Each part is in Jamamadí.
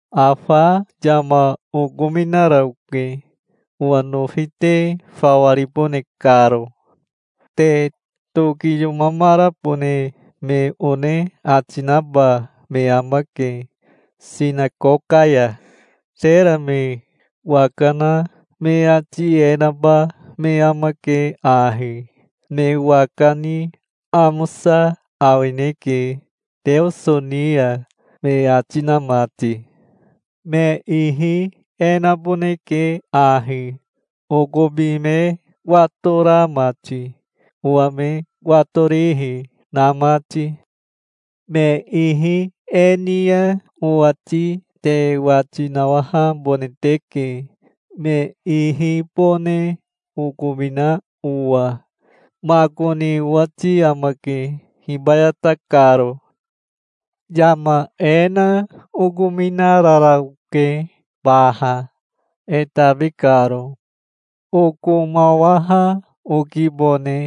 "Afa yama okominara oke, owa nofi te fawa ribone karo. Te tokiyomamarabone me one ati naba me amake sinakoka ya. Tera me waka na me ati e naba me amake ahi: 'Me waka ni amosa awineke Teoso ni ya', me ati na mati. Me ihi e naboneke ahi, okobi me watora mati, owa me watorihi na mati. Me ihi e ni ya owati te wati nawahabone teke, me ihibone okomina owa. Makoni owati amake hibayata karo". "Yama e na okominarara oke baha, e tabi karo. Okomawaha okibone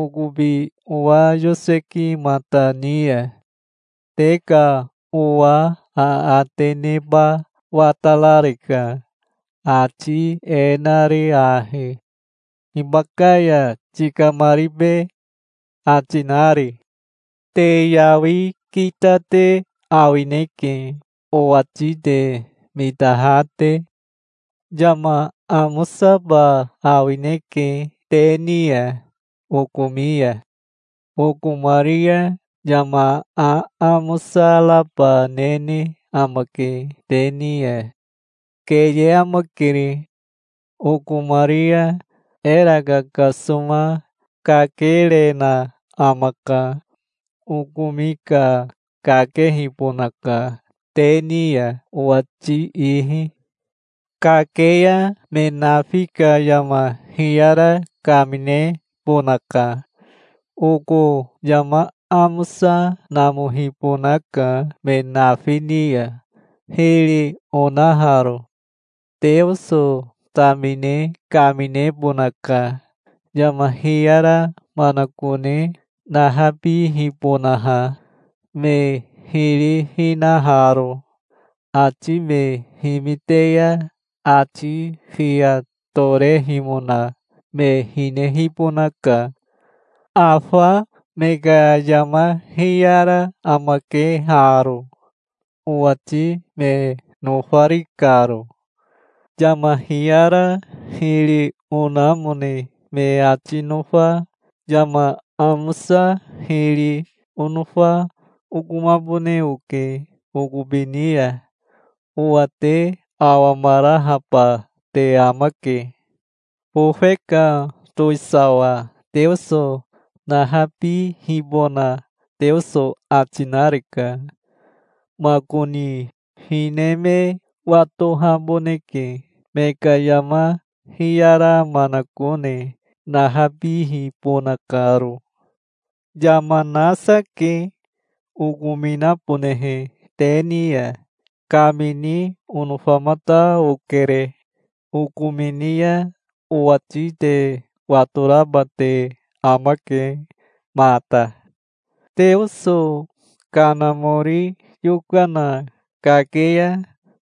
okobi owa yosekimata ni ya. Te ka owa aate neba watarareka, ati e nari ahi: 'Hibaka ya tikamaribe?' ati nari. Te yawi kita te awineke, owati te mitaha te. Yama amosaba awineke te ni ya okomi ya. Okomari ya yama aamosa raba nene amake te ni ya. Keye amakere. Okomari ya era kakasoma kakerena amaka. Okomi ka kakehibonaka, te ni ya owati ihi. Kake ya me nafi ka yama hiyara kaminebonaka. Oko yama amosa namohibonaka me nafi ni ya, hiri onaharo. Teoso tamine kaminebonaka, yama hiyara manakone nahabihibonaha, me hiri hinaharo. Ati me himite ya ati fiya torehimona me hinehibonaka. Afa me ka yama hiyara amake haro, owati me nofari karo. Yama hiyara hiri onamone me ati nofa yama amosa hiri onofa okomabone oke okobi ni ya. Owa te awamarahaba te amake. Bofe ka towisawa Teoso nahabihibona Teoso ati nareka. Makoni hine me watohaboneke, me ka yama hiyara manakone nahabihibona karo". "Yama nasa ke okominabonehe te ni ya. Kamini onofamata okere. Okomini ya owati te watoraba te amake mata. Teoso Kanamori yokana kake ya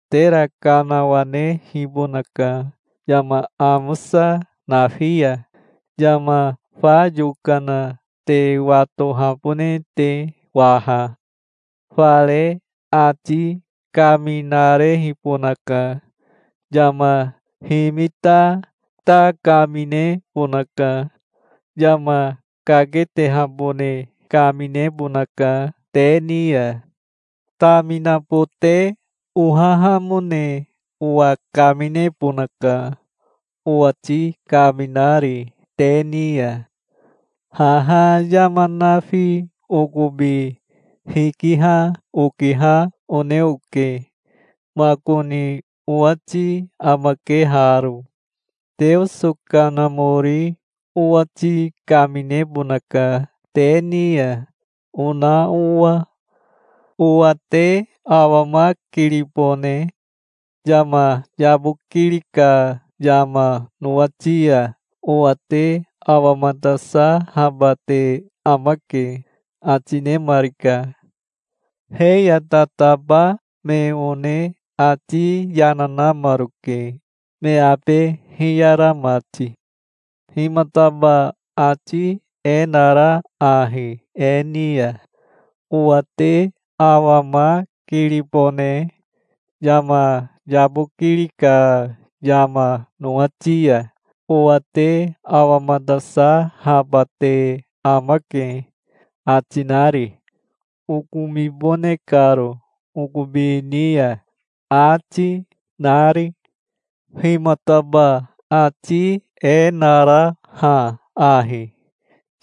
tera kanawanehibonaka yama amosa nafi ya, yama fa yokana te watohabone te waha. Fare ati kaminarehibonaka. Yama himita ta kaminebonaka. Yama kaketehabone kaminebonaka te ni ya. Taminabote ohahamone owa kaminebonaka, owati kaminari te ni ya. Haha yama nafi okobi hikiha okiha one oke. Makoni owati amake haro: 'Teoso Kanamori owati kaminebonaka te ni ya', ona owa". "Owa te awamakiribone. Yama yabokiri ka yama nowati ya owa te awamatasahaba te amake", ati nemarika. He ya tataba me one ati yana namaroke, me abe hiyara mati. "Himataba ati e nara ahi e ni ya: 'Owa te awamakiribone. Yama yabokiri ka yama nowati ya owa te awamatasahaba te amake', ati nari? 'Okomibone karo okobi ni ya', ati, nari? Himataba ati e nara ha ahi: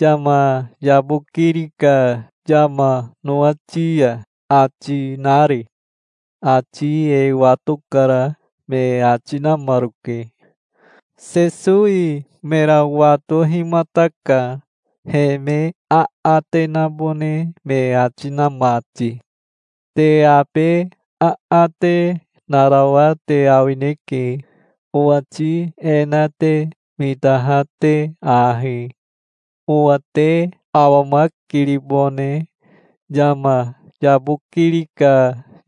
'Yama yabokiri ka yama nowati ya', ati nari? Ati e watokara", me ati namaroke. Sesowi mera watohimataka, he me aate nabone me ati na mati. "Te abe aate narawa te awineke, owati e na te mitaha te ahi: 'Owa te awamakiribone. Yama yabokiri ka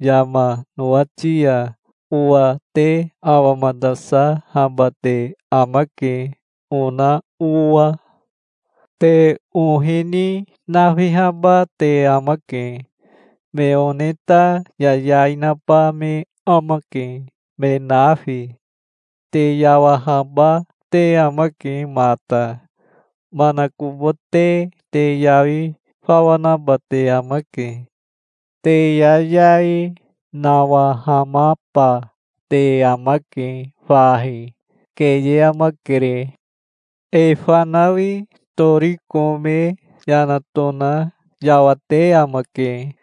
yama nowati ya owa te awamatasahaba te amake', ona owa. Te ohi ni nafihaba te amake. Me one ta yayai naba me amake me nafi. Te yawahaba te amake mata. Manakobote te yawi fawa naba te amake. Te yayai nawahamaba te amake fahi. Keye amakere. E fanawi tori kome yana tona yawate amake.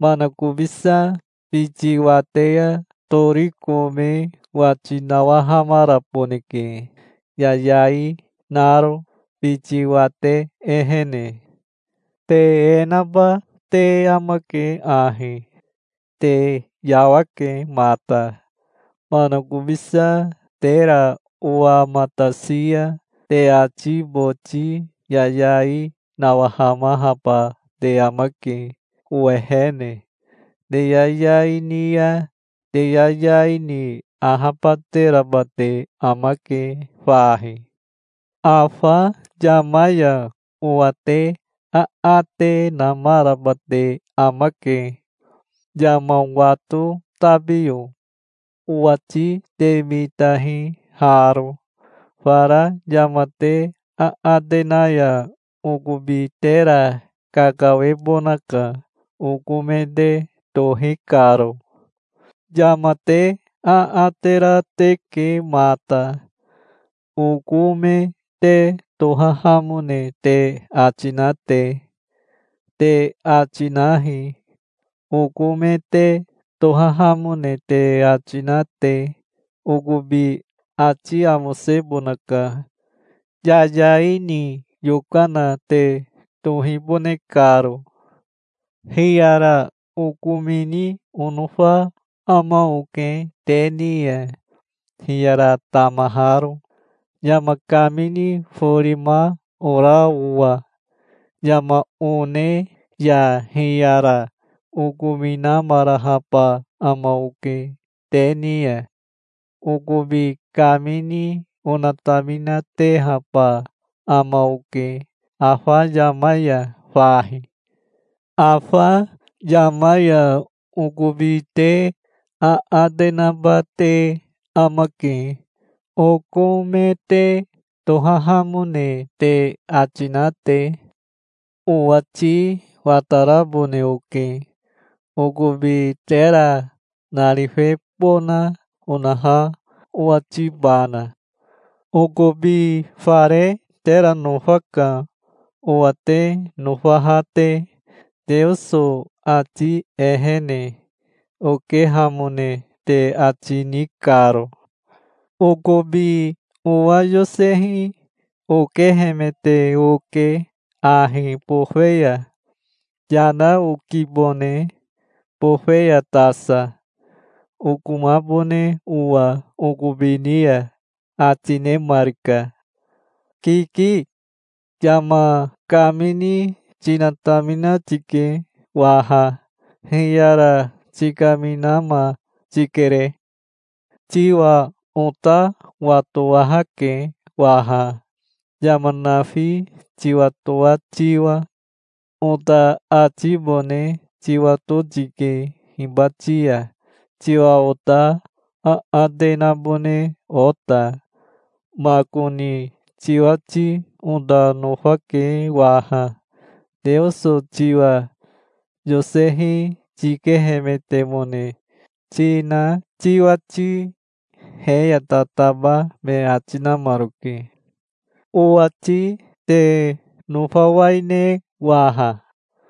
Manakobisa biti wate ya tori kome wati nawahamaraboneke, yayai naro biti wate ehene. Te e naba te amake ahi. Te yawake mata. Manakobisa tera owamatasi ya te ati boti yayai nawahamahaba te amake owehene. Te yayai ni ya te yayai ni ahabateraba te amake fahi. Afa yama ya owa te aate namaraba te amake, yama wato tabiyo. Owati te mitahi haro: Fara yama te aate na ya okobi tera kakawebonaka oko me te tohi karo. Yama te aate ra teke mata, oko me te tohahamone te ati na te. Te ati nahi, oko me te tohahamone te ati na te. Okobi ati amosebonaka, yayai ni yokana te tohibone karo". "Hiyara okomini onofa ama oke te ni ya, hiyara tamaharo, yama kamini forima ora owa. Yama one ya hiyara okominamarahaba ama oke te ni ya. Okobi kamini onataminatehaba ama oke afa yama ya fahi. Afa yama ya okobi te aate naba te amake, oko me te tohahamone te ati na te. Owati watarabone oke, okobi tera narifebona onaha owatibana. Okobi fare tera nofaka, owa te nofaha te, Teoso ati ehene okehamone te ati ni karo. Okobi owa yosehi okehemete oke ahi bofe ya. Yana okibone bofe ya tasa, okomabone owa okobi ni ya", ati nemarika. "Kiki. Yama kamini tinatamina tike waha. Hiyara tikaminama tikere. Tiwa ota watowahake waha, yama nafi tiwatoa tiwa. Ota atibone tiwato tike hibati ya tiwa ota aate nabone ota. Makoni tiwati ota nofake waha, Teoso tiwa yosehi tikehemetemone tina tiwati", he ya tataba me ati namaroke. "Owati te nofawaine waha?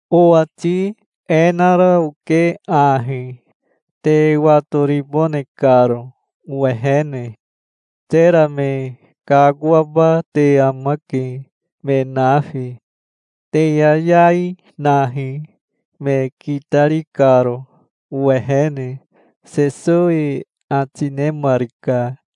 Owati e nara oke ahi, te watoribone karo owehene. Tera me kakoaba te amake, me nafi. Te yayai nahi, me kitari karo owehene", Sesowi ati nemarika.